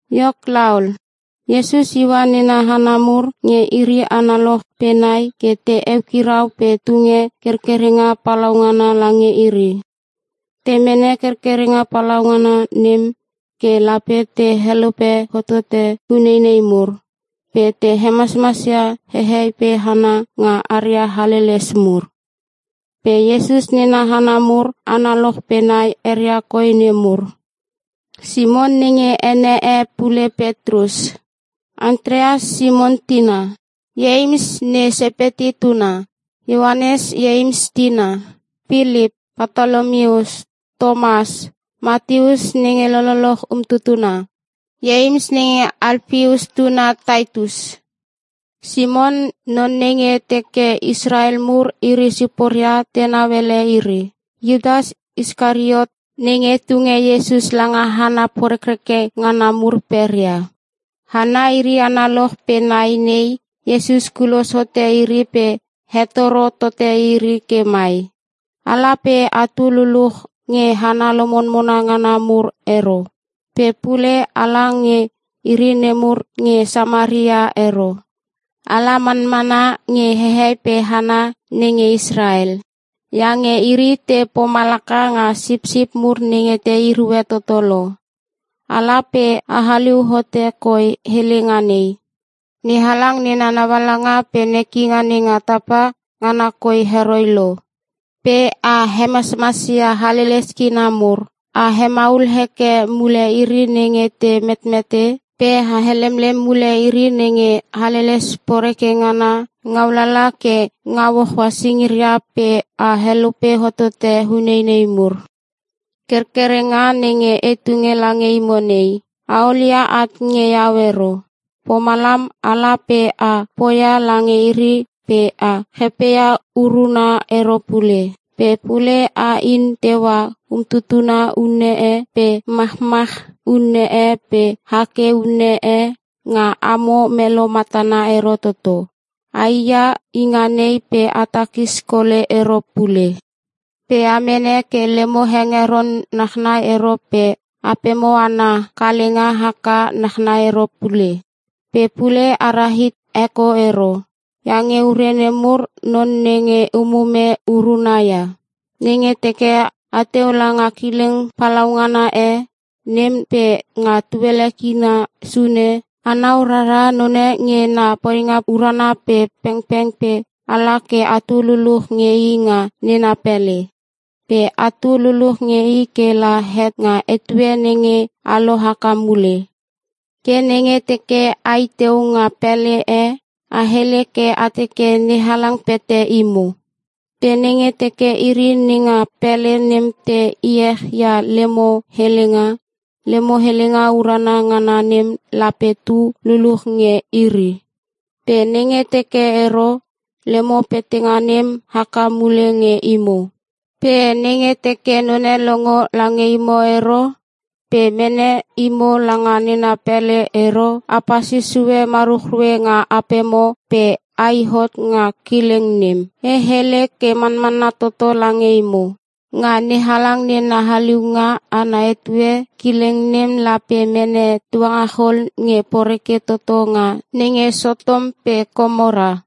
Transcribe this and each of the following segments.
Iok laol, Iesus iua nena hana mur nge iri analoch pe nai ke te eukirau pe tunge kerkerenga palaungana lange iri. Te mene kerkerenga palaungana nem ke lape te helope hotote uneinei mur, pe te hemasmas ia hehei pe hana nga aria haleles mur. Pe Iesus nena hana mur analoch pe nai eria koi nemur: Simon (nenge ene e pule Petrus) Antreas (Simon tina) Ieims (ne Sepeti tuna) Ioanes (Ieims tina) Pilip Patolomius Tomas Mateus (nenge lololoch umtutuna.) Ieims (nenge Alpeus tuna) Tateus Simon (non nenge teke Israel mur iri siporia tenau ele iri) Iutas Iskariot (nenge tunge Iesus langa hana porekreke ngana mur peria) Hana iri analoch pe nai nei, Iesus kulos hote iri pe hetoro tote iri ke mai, “Ala pe atu luluch nge hana lomonmona ngana mur ero. Pe pule ala nge iri nemur nge Samaria ero. Ala manmana nge hehei pe hana nenge Israel iange iri te pomalaka nga sipsip mur nenge te erue toto lo. Ala pe a haliu hote koi helenga nei, ‘NeHalang nena naualanga pe nekinga nenga tapa, ngana koi heroi lo.’ Pe a hemasmas ia haleles kina mur, a hemaul heke mule iri nenge te metmete. Pe a helemlem mule iri nenge haleles poreke ngana ngau lala ke ngau hoa singiria pe a helope hotote uneinei mur. Kerkerenga nenge e tunge lange imo nei, a olia at nge iau ero. Pomalam, a la pe a poia lange iri pe a chepeia uruna ero pule. Pe pule a in teua umtutuna unne e pe machmach unne e pe hake unne e nga amo melo matana ero toto. Ai ia inga nei pe a takis kole ero pule. Pe a mene ke lemo hengeron nachnai ero pe apemo ana kalenga haka nachnai ero pule. Pe pule a ra hit heko ero. Iange ure nemur, non nenge umume uruna ia. “Nenge teke ateu langa kileng palaungana e, nem pe nga tuele kina sune, anau rara none nge na poinga urana pe pengpeng pe a la ke atu luluch nge i nga nena pele. Pe atu luluch nge i ke la het nga etue nenge a lo haka mule. Ke nenge teke a i teu nga pele e, a hele ke a teke NeHalang pete imo. Pe nenge teke iri nenga pele nem te iech ia lemo helenga, lemo helenga urana ngana nem lape tu luluch nge iri. Pe nenge teke ero, lemo petenga nem haka mule nge imo. Pe nenge teke none longo lange imo ero pe mene imo langa nena pele ero, a pasis sue maruchrue nga apemo pe ai hot nga kileng nem. E hele ke manmanna toto lange imo. Nga NeHalang nena haliunga ana etue kileng nem lape mene tuangachol nge poreke toto nga nenge Sotom pe Komora.”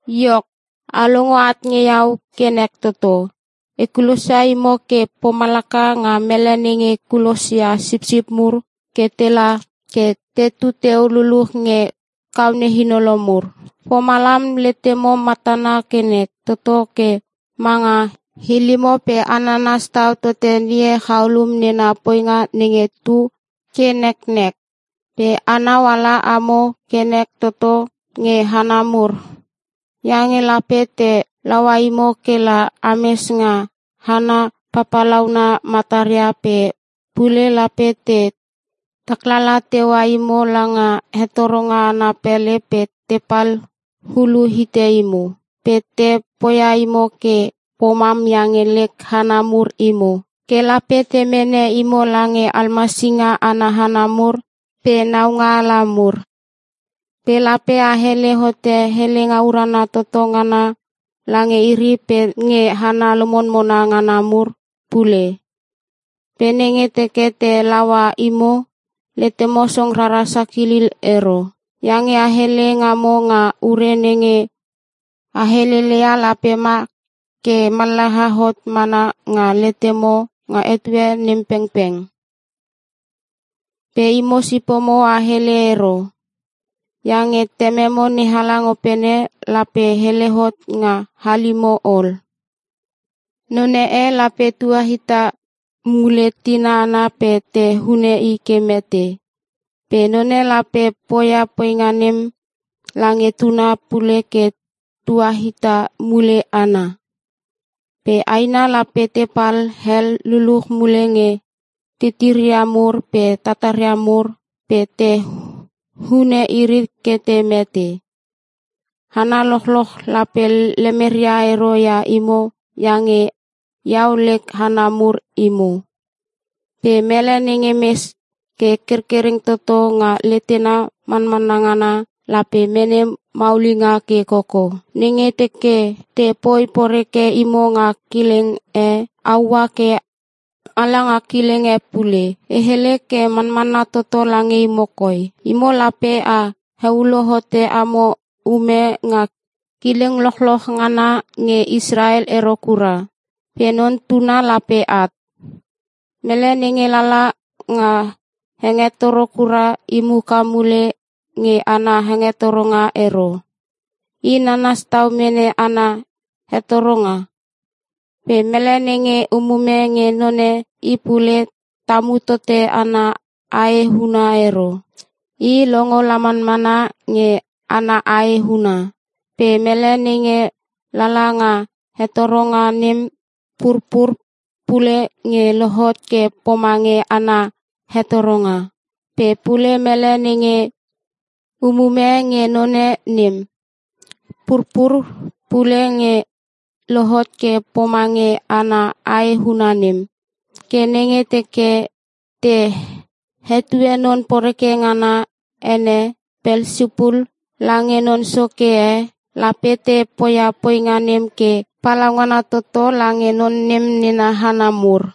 “Iok, a longo at nge iau ke nek toto. E kulosia imo ke pomalaka nga mele nenge kulosia sipsip mur ke tela ke tetu teu luluch nge kaone hinolo mur. Pomalam letemo matana ke nek toto ke manga hilimo pe a nanas tau tote ngie chaulum nena poinga nenge tu ke neknek. Pe anau ala amo ke nek toto nge hana mur. Iange lape te laua imo kela ames nga hana papalauna mataria pe pule lape te taklala teua imo langa hetoronga ana pele pe tepal hulu hite imo. Pe te poia imo ke pomam iange lek hana mur imo. Ke lape te mene imo lange almasinga ana hana mur pe naunga ala mur. Pe lape a hele hote helenga urana toto ngana lange iri pe nge hana lomonmona ngana mur pule. Pe nenge teke te laua imo, letemo song rara sakilil ero. Iange a hele ngamo nga ure nenge a heleleia lape ma ke mallaha hot mana nga letemo nga etue nem pengpeng. Pe imo sipomo a hele ero, iange Tememo NeHalang opene lape hele hot nga halimo ol. “Non e lape tua hita mule tina ana pe te hune i ke mete. Pe none lape poia poinga nem lange tuna pule ke tua hita mule ana. Pe aina lape te pal hel luluch mule nge tetemeria mur pe tataria mur pe te hune iri ke te mete. Hana lochloch lape lemeria ero ia imo iange Iau lek hana mur imo. Pe mele nenge mes ke kerkereng toto nga letena manmanna ngana, lape mene maulinga ke koko. Nenge teke te poi poreke imo nga kileng e, a ua ke a langa kileng e pule. E hele ke manmanna toto lange imo koi. Imo lape a heulo hote amo ume nga kileng lochloch ngana nge Israel ero kura, pe Non Tuna lape at. “Mele nenge lala nga hengetoro kura, i muka mule nge ana hetoronga ero. I nanas tau mene ana hetoronga. Pe mele nenge umume nge none, i pule tamu tote ana ae huna ero. I longo la manmana nge ana ae huna. Pe mele nenge lala nga hetoronga nem purpur pule nge lohot ke pomange ana hetoronga. Pe pule mele nenge umume nge none nem, purpur pule nge lohot ke pomange ana ae huna nem. Ke nenge teke te hetue non poreke ngana ene Pelsipul lange non soke e, lape te poia poinga nem ke palaungana toto lange non nem nena hana mur.”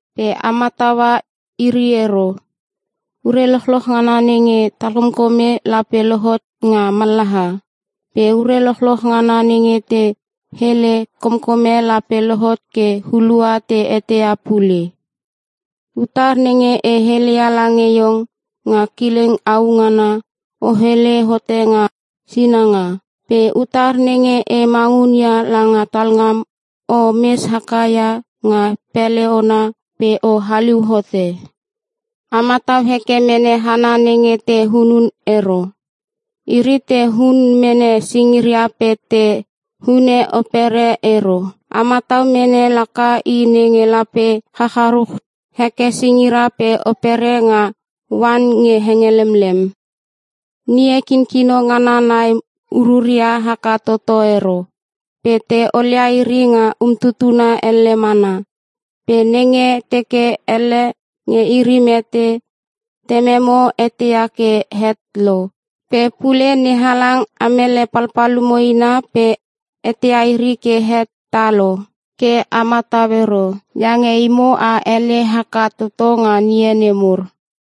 “Pe a mataua iri ero. Ure lochloch ngana nenge talkomkome lape lohot nga mallaha. Pe ure lochloch ngana nenge te hele komkome lape lohot ke hulua te eteia pule. Utar nenge e heleia lange iong nga kileng au ngana, o hele hote nga sinanga. Pe utar nenge e mangun ia langa talngam, o mes haka ia nga pele ona pe o haliu hote. A matau heke mene hana nenge te hunun ero. Iri te hun mene singira pe te hune opere ero. A matau mene laka I nenge lape chacharuch heke singira pe opere nga oan nge henge lemlem. Ngie kinkino ngana nai ururia haka toto ero. Pe te olia iri nga umtutuna elle mana. Pe nenge teke elle nge iri mete, Tememo eteia ke het lo. Pe pule NeHalang amele palpalumo ina pe eteia iri ke het ta lo. Ke a matau ero, iange imo a ele haka toto nga ngie nemur.”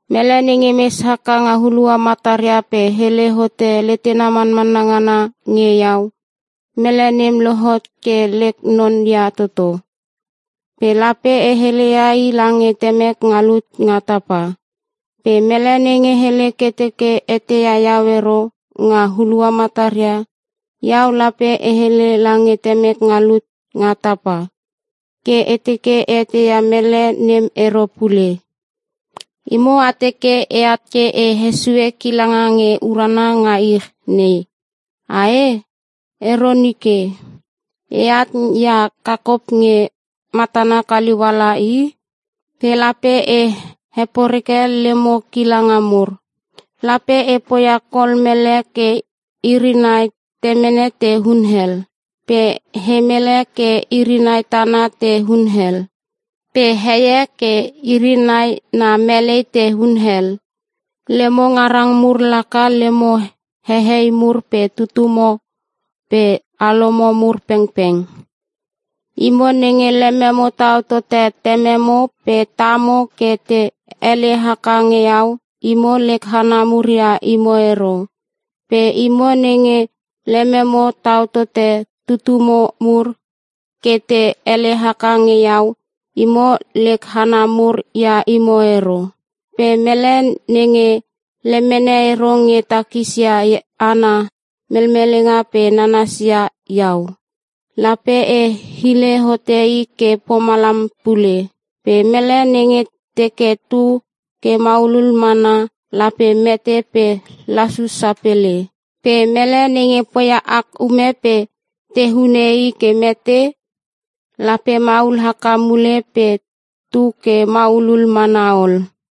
“Mele nenge mes haka nga hulua mataria pe hele hote letena manmanna ngana nge Iau, mele nem lohot ke lek non ia toto. Pe lape e heleia i lange Temek nga lut nga tapa. Pe mele nenge hele ke teke eteia Iau ero nga hulua mataria, Iau lape e hele lange Temek nga lut nga tapa, ke e teke e eteia mele nem ero pule. “Imo a teke e at ke e hesue kilanga nge urana nga ich nei, ae? Ero nike. E at ia kakop nge matana kaliu ala i. Pe lape e heporeke lemo kilanga mur. Lape e poia kol mele ke iri nai temene te hunel, pe he mele ke iri nai tana te hunel, pe heie ke iri nai na melei te hunel. “Lemo ngarang mur laka lemo hehei mur pe tutumo pe alomo mur pengpeng. “Imo nenge lememo tau tote tememo pe tamo ke te ele haka nge iau, imo lek hana mur ia imo ero. Pe imo nenge lememo tau tote tutumo mur ke te ele haka nge iau, imo lek hana mur ia imo ero. Pe mele nenge lemene ero nge takis ia ana melmelenga pe nanas ia iau, lape e hile hote i ke pomalam pule. Pe mele nenge teke tu ke maulul mana, lape mete pe lasus sapele. Pe mele nenge poia ak ume pe te hune i ke mete, lape maul haka mule pe tu ke maulul mana ol.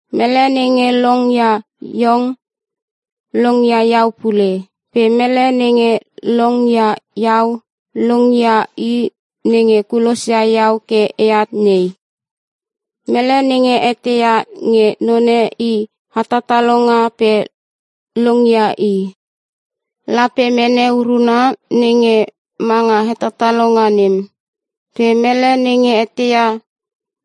“Mele nenge long ia iong, long ia Iau pule. Pe mele nenge long ia Iau, long ia I nenge kulosia Iau ke e at nei. Mele nenge eteia nge none i hetatalonga pe long ia i, lape mene uruna nenge manga hetatalonga nem. Pe mele nenge eteia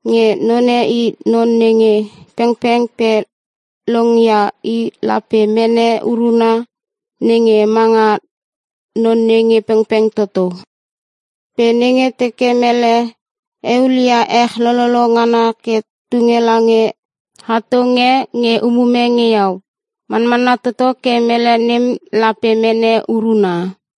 nge none i non nge pengpeng pe long ia i lape mene uruna nenge manga non nenge pengpeng toto. “Pe nenge teke mele eulia ech lololo ngana ke tunge lange hatong e nge umume nge iau, manmanna toto ke mele nem lape mene uruna.”